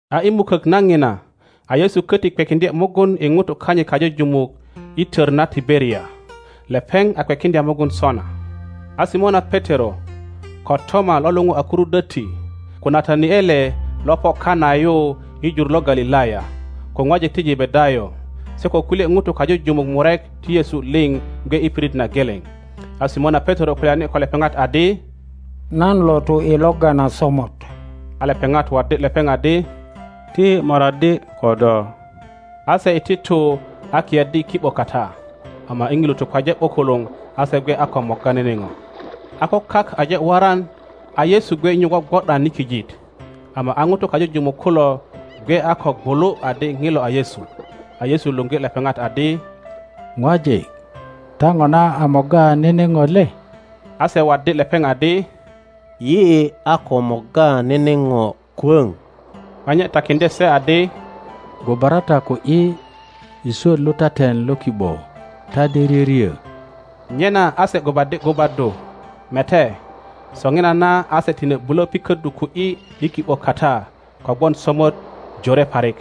A i mukök na ŋina a Yesu köti kwekiŋdye mugun i ŋutu kanyit kajujumuk i tör na Tiberia; lepeŋ a kwekiŋdya mugun sona. a Simona Petero, ko Toma lo luŋu a Kurudwötti, ko Nataniele lo po Kana yu i jur lo Galilaya, ko ŋwajik ti Jebedayo, se ko kulye ŋutu kajujumuk murek ti Yesu liŋ gwe i pirit na geleŋ. A Simona Petero kulyani ko lepeŋat adi, Nan lo tu i logga na somot. A lepeŋat waddi lepeŋ adi, Ti yi moraddi ko do. A se iti tu a kiyaddi i ki ’bo kata, ama i ŋilu tukwaje ’bukuluŋ a se gwe a ko morga nene ŋo. A ko kak aje waran, a Yesu gwe nyu gwogwo ’dan i kijit, ama a ŋutu kajujumuk kulo gwe a ko gwulu adi ŋilo a Yesu. A Yesu luŋgi lepeŋat adi, Ŋwajik, ta ŋona a morga nene ŋo le? A se waddi lepeŋ adi, Yi a ko morga nene ŋo kwöŋ. A nye takiŋdye se adi, Gubara ta ku ’yi i swöt lutaten lo ki ’bo, ta de ryöryö. Nyena a se gubaddi gubaddu, mete, soŋinana a se tine bulö piköddu ku ’yi i ki ’bo kata, kogwon somot jore parik.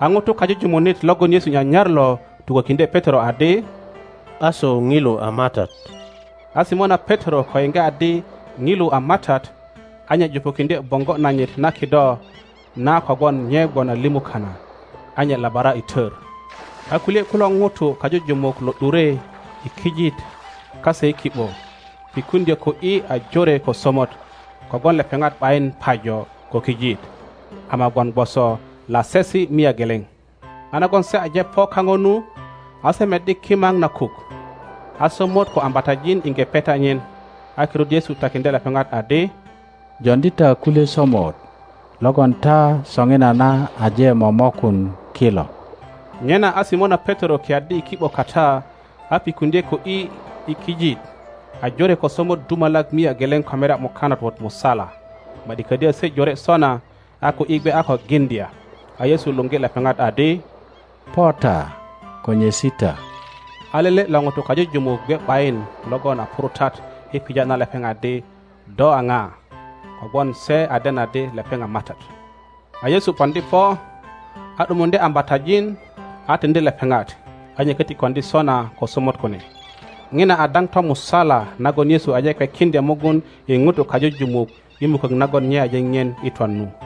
a ŋuto kajujumunit logon Yesu nyanyar lo tukökiŋdye Petero adi, Aso ŋilu a MATAT! A Simona Petero ko yiŋge adi ŋilu a MATAT, a nye jupukiŋdye boŋgo nanyit na kido na kogwon nye gwon a limu kana, a nye labara i tor; a kulye kulo ŋutu kajujumuk lo ’dure i kijit kase i ki ’bo, pikuŋdyö ku ’yi a jore ko somot, kogwon lepeŋat ’bayin pajo ko kijit, ama gwon gwoso lasesi mia geleŋ. A nagon se aje po kaŋo nu, a se meddi kimaŋ na kuk, a somot ko ambatajin iŋge peta nyin. A kirut Yesu takiŋdye lepeŋat adi, Joŋdi ta kulye somot logon ta soŋinana aje momokun kilo. Nyena a Simona Petero kiyaddi i ki ’bo kata a pikuŋdye ku ’yi i kijit, a jore ko somot dumalak mia geleŋ ko merya mukanat wot musala. Ma ’di ködyo se jore sona, a ku ’yi gwe a ko giŋdya. A Yesu luŋgi lepeŋat adi, Po ta, ko nyesi ta. A lelelo ŋutu kajujumuk gwe ’bayin logon a purutat i pija na lepeŋ adi, Do a ŋa? kogwon se a den adi lepeŋ a MATAT. A Yesu poŋdi po, a ’dumuŋdye ambatajin, a tiŋdi lepeŋat, a nye köti koŋdi sona ko somot kune. Ŋina a daŋ tomusala nagon Yesu aje kwekiŋdya mugun i ŋutu kajujumuk i mukök nagon nye aje ŋien i twan nu.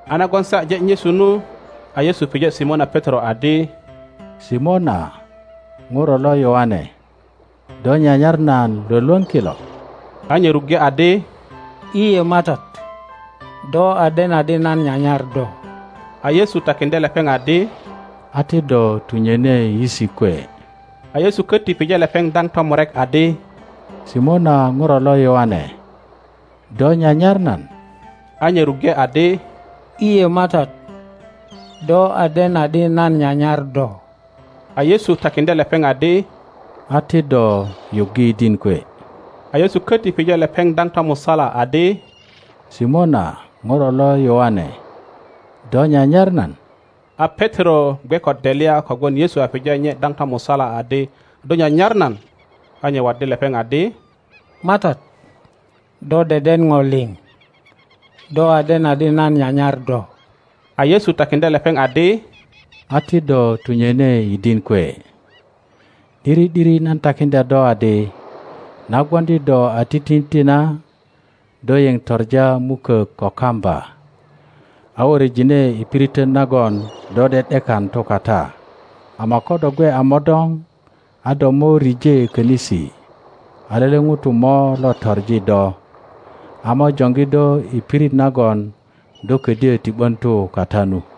A nagon se aje nyesu nu, a Yesu pije Simona Petero adi, Simona ŋuro lo Yöaŋe, do nyanyar nan Iwolwöŋ kilo? A nye ruŋge adi, lye MATAT, do a den adi nan nyanyar do. A Yesu takiŋdye lepeŋ adi. A ti do tunyoni yisi kwe. A Yesu koti pije lepeŋ daŋ tomurek adi, Simona ŋuro lo Yoane, do nyanyar nan? A nye ruŋge adi, lye MATAT, do a den adi nan nyanyar do. A Yesu takiŋdye lepeŋ adi, A ti do yuggi yidin kwe. a Yesu köti pije lepeŋ daŋ tomusala adi, Simona ŋuro lo Yöaŋe, do nyanyar nan? A Petero gwe ko delya kogwon Yesu a pija nye daŋ tomusala adi, Do nyanyar nan? A nye waddi lepeŋ adi, MATAT, do deden ŋo liŋ; do a den adi nan nyanyar do. A Yesu takiŋdye lepeŋ adi, A ti do tunyöni yidin kwe. ’Diri ’diri nan takiŋdya do adi, Na gwoŋdi do a titinti na, do yeŋ toŋa mukök ko kamba a wöröjine i piritön nagon do ’de ’dekan tu kata; ama ko do gwe a modoŋ, a do mo rije könisi a lele ŋuto mo lo toŋi do, a mo joŋgi do i pirit nagon do ködyö ti ’bön tu kata nu.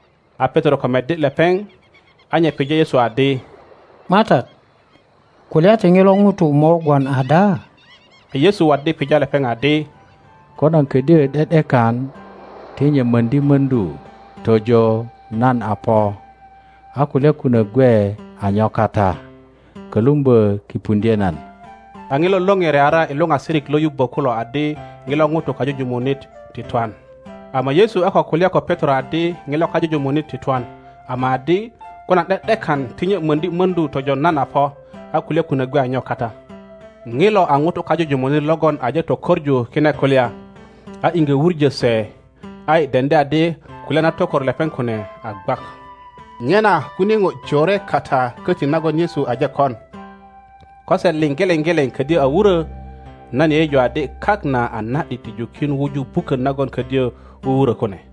a Petero ko meddi lepeŋ, a nye pije Yesu adi, MATAT, kulya ti ŋilo ŋuto mo gwon ada? A Yesu waddi pija lepeŋ adi, Ko nan ködyö ’de ’dekan ti nye möŋdi möŋdu tojo nan a po, a kulya kunök gwe a nyo kata? Kölumbö kipuŋdye nan. a ŋilo lore reara i luŋasirik lo yubbö kulo adi ŋilo ŋuto kajujumunit ti twan. Ama Yesu a ko kulya ko Petero adi ŋilo kajujumunit ti twan, ama adi, Ko nan ’de ’dekan ti nye möŋdi mordu tojo nan a po, a kulya kunok gwe a nyo kata? Ŋilo a ŋuto kajujumunit logon aje tokoŋu kine kulya, a iŋge wuŋo se, a yi deŋdi adi kulya na tokor lepeŋ kune a gwak. Nyena kunie ŋo jore kata koti nagon Yesu aje kon. Ko se liŋ geleŋ geleŋ kodyö a wurö, nan yeyeju adi kak na a na ’dit ti jukin wuju bukön nagon ködyo wuwurö kune.